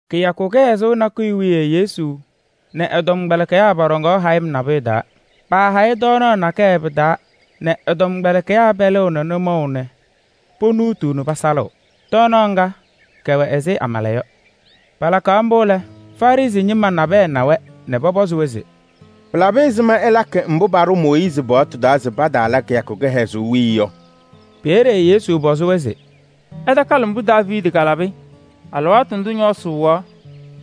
Kɩyakʋ kɩhɛzʋʋ nakʋyʋ wiye Yesu nɛ ɛ-tɔmkpɛlɩkɩyaa pɔɖɔŋaɣ hayɩm nabʋyʋ taa. Paahayɩ tɔɔnaɣ nakɛyɛ pɩ-taa nɛ ɛ-tɔmkpɛlɩkɩyaa pɛlɩɣ nɛ nʋmɔʋ nɛ ponuutuu nɛ pasalɩɣ. Tɔɔnaɣ ŋga kɛwɛ ɛzɩ amala yɔ. Palakaɣ mbʋ lɛ, Farɩsɩ ñɩma nabɛyɛ na-wɛ nɛ pɔpɔzɩ-wɛ se: “Pɩlabɩ ɛzɩma ɩlakɩ mbʋ paɖʋ Mooyiizi paɣtʋ taa se pataala kɩyakʋ kɩhɛzʋʋ wiye yɔ?” Peeye Yesu pɔzɩ-wɛ se: “Ɩtakalɩ mbʋ Daaviidi kalabɩ alɩwaatʋ ndʋ ñɔɔsɩ wɩɣaɣ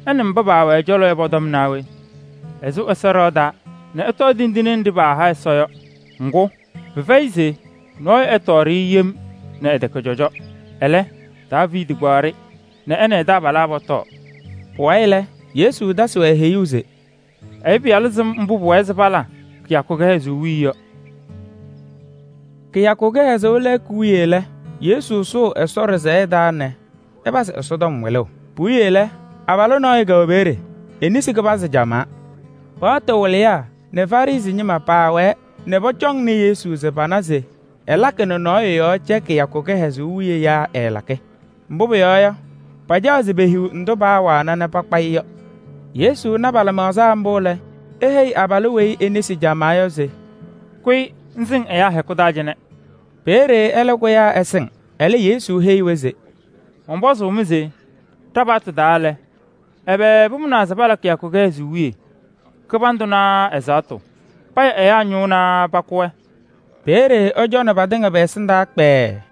ɛ nɛ mba paawɛ ɛ-cɔlɔ yɔ pʋ-tɔm naa we? Ɛsʋ Ɛsɔ ɖɩɣa taa nɛ ɛtɔɔ tindine wena paaha Ɛsɔ yɔ. Ŋgʋ, pɩfɛyɩ se nɔɔyʋ ɛtɔɔ-yɛ yem nɛ ɛtɛkɛ cɔjɔ. Ɛlɛ, Daaviidi kpaɣ-yɛ nɛ ɛ nɛ ɛ-taabalaa pɔtɔɔ” Pʋwayɩ lɛ, Yesu tasɩ-wɛ heyuu se: “Ɛyʋ Pɩyalʋ sɩm mbʋ pʋwɛɛ se pala kɩyakʋ kɩhɛzʋʋ wiye yɔ.” Kɩyakʋ kɩhɛzʋʋ lɛɛkʋ wiye lɛ, Yesu sʋʋ Ɛsɔ ɖɩsɛyɛ taa nɛ ɛpazɩ Ɛsɔtɔm wɩlʋʋ. Puwiye lɛ, abalʋ nɔɔyʋ kɛwɛ peeye, e-nesi kɩbanzɩ camaa. Paɣtʋ wɩlɩyaa nɛ Farɩsɩ ñɩma paawɛɛ nɛ pɔcɔŋnɩ Yesu se pana se ɛlakɩ nɛ nɔɔyʋ yɔɔ cɛ kɩyakʋ kɩhɛzʋʋ wiye yaa ɛɛlakɩ? Mbʋ pʋyɔɔ yɔ, pacaɣ se pehiɣ ndʋ paawana nɛ pakpa-ɩ yɔ. Yesu na pa-lɩmaɣza mbʋ lɛ, eheyi abalʋ weyi e-nesi camaa yɔ se: “Kʋyɩ ŋsɩŋ ɛyaa tɩŋa hɛkʋ taa cɩnɛ!” Peeye ɛlɛ kʋyaa ɛsɩŋ. Ɛlɛ Yesu heyi-wɛ se: “Mɔnpɔzʋʋ-mɩ se ɖa-paɣtʋ taa lɛ, ɛbɛ pʋmʋnaa se pala kɩyakʋ kɩhɛzʋʋ wiye? Kɩbandʋ naa ɛzaɣtʋ? Paya ɛyaa ñʋʋ naa pakʋ-wɛ?” Peeye ɛcɔnɩ patɩŋa pɛ-ɛsɩndaa kpɛɛɛ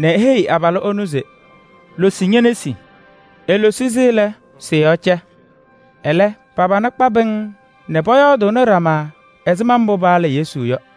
nɛ eheyi abalʋ ɛnʋ se: “Losi ñe-nesi!” Elosi-si lɛ, sɩ-yɔɔ cɛ. Ɛlɛ, pa-pana kpa pɩŋŋ nɛ pɔyɔɔdʋʋnɩ ɖama ɛzɩma mbʋ paala Yesu yɔ.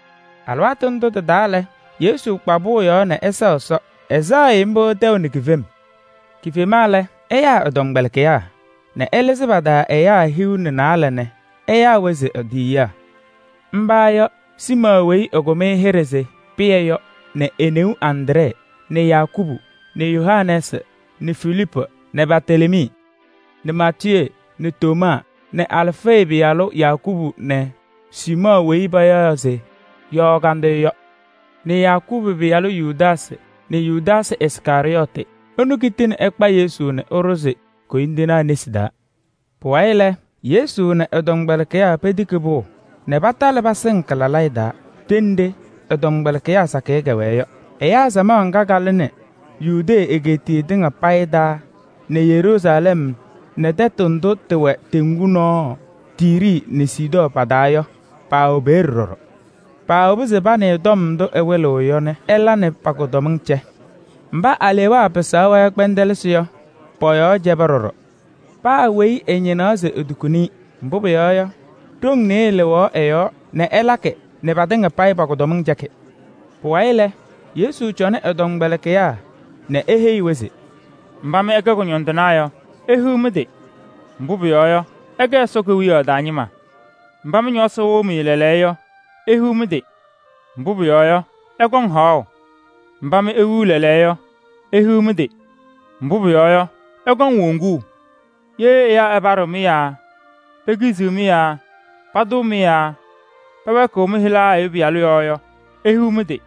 Alɩwaatʋ ndʋ tɩ-taa lɛ, Yesu kpa pʋʋ yɔɔ se ɛsɛɣ Ɛsɔ. Ɛsɛɛ-ɩ mbʋ tɛʋ nɛ kifem. Kifema lɛ, ɛyaa ɛ-tɔmkpɛlɩkɩyaa nɛ ɛlɩzɩ pa-taa ɛyaa hiu nɛ naalɛ nɛ ɛyaa-wɛ se e-tiyiyaa. Mba yɔ: Siimɔɔ weyi ɛkʋm-ɩ hɩɖɛ se Pɩyɛ yɔ nɛ e-neu Andree nɛ Yakubu nɛ Yohanɛɛsɩ nɛ Filiipu nɛ Bartelemii nɛ Maatiyee nɛ Tomaa nɛ Alfee pɩyalʋ Yakubu nɛ Siimɔɔ weyi payaɣ se Yɔɔ Kandɩyʋ yɔ nɛ Yakubu pɩyalʋ Yudaasɩ nɛ Yudaasɩ Iskarɩyɔɔtɩ. Ɛnʋ kitini ɛkpa Yesu nɛ ɛɖʋzɩ koyindinaa nesi taa. Pʋwayɩ lɛ, Yesu nɛ ɛ-tɔmkpɛlɩkɩyaa petiki pʋʋ nɛ patalɩ pasɩŋ kɩ-lalayɛ taa ɖenɖe ɛ-tɔmkpɛlɩkɩyaa sakɩyɛ kɛwɛɛ yɔ. Ɛyaa samaɣ ŋga kalɩnɩ Yudee egeetiye tɩŋa payɩ taa nɛ Yeruusalɛm nɛ tɛtʋ ndʋ tɩwɛ teŋgu nɔɔ: Tiiri nɛ Sidɔɔ pa-taa yɔ, paawɛ peeye ɖɔɖɔ. Paawobi se panɩɩ tɔm ndʋ ɛwɩlɩɣ yɔ nɛ ɛla nɛ pa-kʋdɔmɩŋ cɛ. Mba alewaa pɩsaɣ-wɛ kpɛndɛlɩsɩ yɔ, pɔ-yɔɔ cɛba ɖɔɖɔ. Paa weyi ɛñɩnaɣ se etukuni-i. Mbʋ pʋyɔɔ yɔ, ɖoŋ nɩɩyɩ lɩɣaɣ ɛ-yɔɔ nɛ ɛlakɩ nɛ patɩŋa payɩ pa-kʋdɔmɩŋ cɛkɩ. Pʋwayɩ lɛ, Yesu cɔnɩ ɛ-tɔmkpɛlɩkɩyaa nɛ eheyi-wɛ se: “Mba mɩ ɩkɛ kʋñɔndɩnaa yɔ, ihiɣ mɩ-tɩ! Mbʋ pʋyɔɔ yɔ, ɩkɛ Ɛsɔ Kewiyaɣ taa ñɩma. Mba mɩ ñɔɔsɩ wɩɣ-mɩ lɛɛlɛɛyɔ yɔ, ihiɣ mɩ-tɩ! Mbʋ pʋyɔɔ yɔ, ɩkɔŋ haɣʋ. Mba mɩ iwiɣ lɛɛlɛɛyɔ yɔ, ihiɣ mɩ-tɩ! Mbʋ pʋyɔɔ yɔ, ɩkɔŋ woŋuu. Ye ɛyaa ɛpaɖɩɣ-mɩ yaa pekiziɣ-mɩ yaa patʋʋ-mɩ yaa pɛwɛɛkɩɣ mɩ-hɩla Ɛyʋ Pɩyalʋ yɔɔ yɔ, ihiɣ mɩ-tɩ!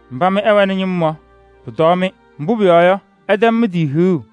Mba mɩ ɩwɛnɩ ñɩm yɔ, pʋtɔɔ-mɩ. Mbʋ pʋyɔɔ yɔ, ɩtɛm mɩ-tɩ hiɣu.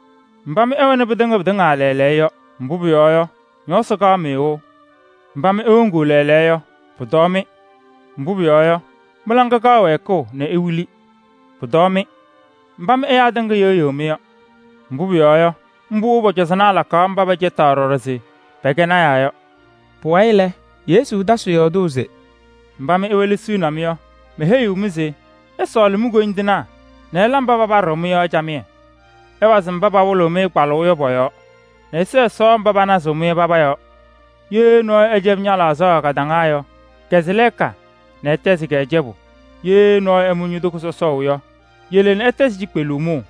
Mba mɩ ɩwɛnɩ pɩtɩŋa pɩtɩŋa lɛɛlɛɛyɔ yɔ, pʋtɔɔ-mɩ! Mbʋ pʋyɔɔ yɔ, ñɔɔsɩ kaɣ-mɩ wɩʋ. Mba mɩ iwoŋuu lɛɛlɛɛyɔ yɔ, pʋtɔɔ-mɩ! Mbʋ pʋyɔɔ yɔ, mɩ-laŋa kaɣ wɛɛkʋʋ nɛ iwili. Mba mɩ ɛyaa tɩŋa yɩɣyɩɣ-mɩ yɔ, pʋtɔɔ-mɩ! Mbʋ pʋyɔɔ yɔ, mbʋ pɔ-cɔzɔnaa lakaɣ mba pɛcɛtaɣ ɖɔɖɔ se pɛkɛ lɔɔyɩsɩ tɩnaa yɔ.” Pʋwayɩ lɛ, Yesu tasɩ yɔɔdʋʋ se: “Mba mɩ iwelesiɣni-m yɔ, meheyiɣ-mɩ se ɩsɔɔlɩ mi-koyindinaa nɛ ɩla mba papaɖɩɣ-mɩ yɔ camɩyɛ. Ɩwazɩ mba pawɩlɩɣ-mɩ kpalʋʋ yɔ pɔ-yɔɔ nɛ ɩsɛɛ Ɛsɔ mba panazɩɣ-mɩ yɔ paba yɔɔ. Ye nɔɔyʋ ɛcɛbɩ ña-laɣzaɣ kadaŋa yɔ, kɛzɩ lɛɛka nɛ ɛtɛzɩ-kɛ cɛbʋ. Ye nɔɔyʋ ɛmʋ ño-toko sɔsɔʋ yɔ, yele nɛ ɛtɛzɩ cikpeluu mʋʋ.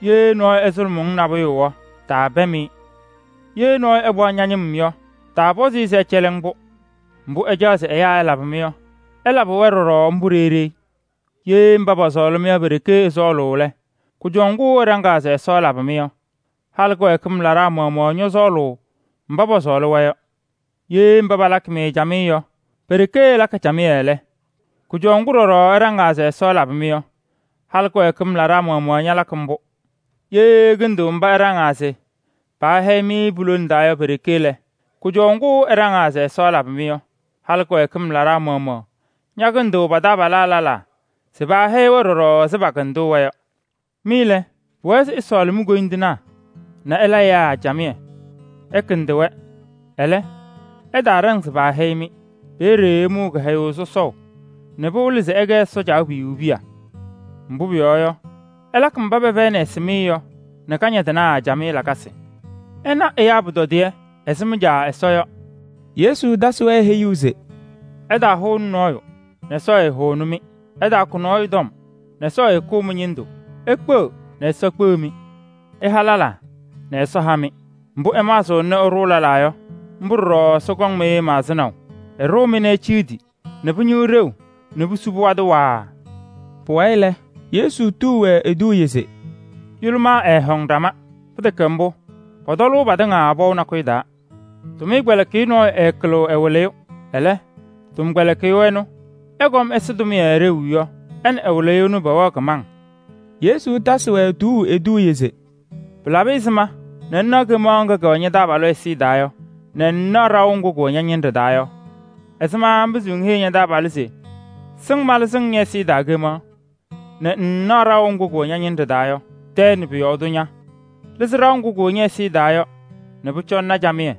Ye nɔɔyʋ ɛsʋlʋmɩ-ŋ nabʋyʋ yɔ, taapɛm-ɩ. Ye nɔɔyʋ ɛkpaɣ ña-ñɩm yɔ, taapɔzɩ-ɩ se ɛcɛlɩ-ŋ-pʋ. Mbʋ ɩcaɣ se ɛyaa ɛlabɩ-mɩ yɔ, ɩlabɩ-wɛ ɖɔɖɔ mbʋ ɖeyi ɖeyi. Ye mba pɔsɔɔlɩ-mɩ yɔ pe-ɖeke ɩsɔɔlʋʋ lɛ, kʋjɔʋ ŋgʋ ɩɖaŋɩɣ se Ɛsɔ ɛlabɩ-mɩ yɔ? Halɩ kɩwɛɛkɩm laɖaa maɣmaɣ ñɔsɔɔlɩ mba pɔsɔɔlɩ-wɛ yɔ. Ye mba palakɩ-mɩ camɩyɛ yɔ pe-ɖeke ɩlakɩ camɩyɛ lɛ, kʋjɔʋ ŋgʋ ɖɔɖɔ ɩɖaŋɩɣ se Ɛsɔ ɛlabɩ-mɩ yɔ? Halɩ kɩwɛɛkɩm laɖaa maɣmaɣ ñalakɩ mbʋ. Ye ɩkɩndɩɣ mba ɩɖaŋɩɣ se paahɛyɩ-mɩ pu-lone taa yɔ pe-ɖeke lɛ, kʋjɔʋ ŋgʋ ɩɖaŋɩɣ se Ɛsɔ ɛlabɩ-mɩ yɔ? Halɩ kɩwɛɛkɩm laɖaa maɣmaɣ ñakɩndɩɣ pa-taabalaa lɛlaa se paahɛyɩ-wɛ ɖɔɖɔ ɛzɩ paakɩndʋʋ-wɛ yɔ. Mɩ lɛ, pʋwɛɛ se ɩsɔɔlɩ mi-koyindinaa nɛ ɩla ɛyaa camɩyɛ. Ɩkɩndɩ-wɛ, ɛlɛ, ɩtaaɖaŋ se paahɛyɩ-mɩ. Peeye ɩmʋʋ kɩhɛyʋʋ sɔsɔʋ nɛ pɩwɩlɩ se ɩkɛ Ɛsɔ Caabiyuu piya. Mbʋ pʋyɔɔ yɔ, ɛlakɩ mba pɛfɛyɩnɩ ɛsɩmɩyɛ yɔ camɩyɛ nɛ kañadɩnaa. Ɩna ɛyaa pʋtɔdɩyɛ ɛzɩ mɩ-Caa Ɛsɔ yɔ.” Yesu tasɩ-wɛ heyuu se: “Ɩtaahʋnɩ nɔɔyʋ nɛ Ɛsɔ ɛtaahʋnɩ-mɩ. Ɩtaakʋ nɔɔyʋ tɔm nɛ Ɛsɔ ɛtaakʋ mɩ-ñɩndʋ. Ikpeɣ nɛ Ɛsɔ kpeɣ-mɩ. Ɩha lɛlaa nɛ Ɛsɔ ha-mɩ. Mbʋ ɩmaɣzɩɣna nɛ ɩɖʋʋ lɛlaa yɔ, mbʋ ɖɔɖɔ Ɛsɔ kɔŋ-mɩ maɣzɩnaʋ. Ɛɖʋʋ-mɩ nɛ eciɣdi nɛ pɩñɩɣ ɖeu nɛ pusu pɩwadɩ waaa.” Pʋwayɩ lɛ, Yesu tuu-wɛ eduuye se: “Yʋlʋmaa ɛɛhɔŋ ɖama. Pɩtɛkɛ mbʋ, pɔtɔlʋʋ patɩŋa pɔʋ nakʋyʋ taa. Tʋmɩyɛ tɔmkpɛlɩkɩyʋ nɔɔyʋ ɛɛkɩlɩɣ ɛ-wɩlɩyʋ. Ɛlɛ, tɔmkpɛlɩkɩyʋ ɛnʋ ɛkɔm ɛsɩ tʋmɩyɛ ɖeu yɔ, ɛ nɛ ɛ-wɩlɩyʋ ɛnʋ pɛwɛɣ kɩmaŋ.” Yesu tasɩ-wɛ tuuu eduuye se: “Pɩlabɩ ɛzɩma nɛ ŋnaɣ kemaɣ ŋga kɛwɛ ña-taabalʋ ɛzɩyɛ taa yɔ nɛ ŋŋnaɣ ɖaʋ ŋgʋ kʋwɛ ña-ñɩnɖɛ taa yɔ? Ɛzɩma ŋpɩzɩɣ ŋheyi ña-taabalʋ se: ‘Sɩŋ malɩzɩ-ŋ ñɛ-ɛzɩyɛ taa kemaɣ’ nɛ ŋŋnaɣ ɖaʋ ŋgʋ kʋwɛ ña-ñɩnɖɛ taa yɔ? Tɛɛ nɛ pʋ-yɔɔ tʋ ña! Lɩzɩ ɖaʋ ŋgʋ kʋwɛ ñɛ-ɛzɩyɛ taa yɔ nɛ pʋcɔ ŋna camɩyɛ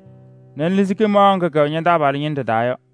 nɛ ŋlɩzɩ kemaɣ ŋga kɛwɛ ña-taabalʋ ñɩnɖɛ taa yɔ.”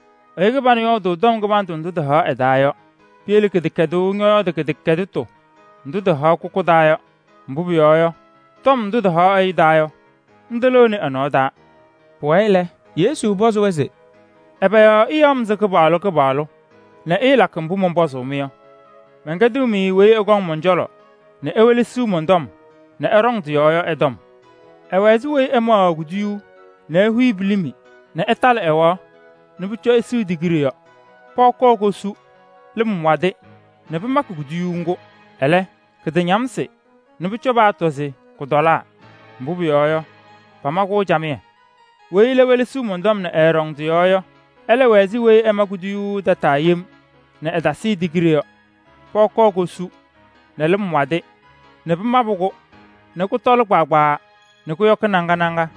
Ɛyʋ kɩbanʋ yɔɔdʋʋ tɔm kɩbandʋ ndʋ tɩhaɣ ɛ-taa yɔ. Piyele kɩdɛkɛdʋʋ ñɔyɔɔdʋʋ kɩdɛkɛdɩtʋ ndʋ tɩhaɣ kʋkʋ taa yɔ. Mbʋ pʋyɔɔ yɔ, tɔm ndʋ tɩhaɣ ɛyʋ taa yɔ, ndʋ lɩɣnɩ ɛ-nɔɔ taa.” Pʋwayɩ lɛ, Yesu pɔzɩ-wɛ se: “Ɛbɛ yɔɔ ɩyaɣ-m se Kɩpaɣlʋ Kɩpaɣlʋ nɛ ɩɩlakɩ mbʋ mɔnpɔzʋʋ-mɩ yɔ? Mɛnkɛdɩɣ-mɩ weyi ɛkɔŋ mɔn-cɔlɔ nɛ ewelesiɣ mɔn-tɔm nɛ ɛɖɔŋ tɩ-yɔɔ yɔ ɛ-tɔm. Ɛwɛ ɛzɩ weyi ɛmaɣaɣ kuduyuu nɛ ehuyi pilimi nɛ ɛtalɩ ɛwaɣ nɛ pʋcɔ ɛsɩɩ tigiɖe yɔ. Pɔɔ kɔɔ kosu, lɩm wadɩ nɛ pɩmakɩ kuduyuu ŋgʋ, ɛlɛ, kɩtañamsɩ tɛ kɩɩtɔlɩ. Mbʋ pʋyɔɔ yɔ, pama-kʋ camɩyɛ. Weyi ɛlɛ welesiɣ mɔn-tɔm nɛ ɛɛɖɔŋ tɩ-yɔɔ yɔ, ɛlɛ wɛ ɛzɩ weyi ɛma kuduyuu tataa yem nɛ ɛtasɩɩ tigiɖe yɔ. Pɔɔ kɔɔ kosu nɛ lɩm wadɩ nɛ pɩmabɩ-kʋ nɛ kʋtɔlɩ kpaagbaa nɛ kʋyɔkɩ naŋa naŋa.”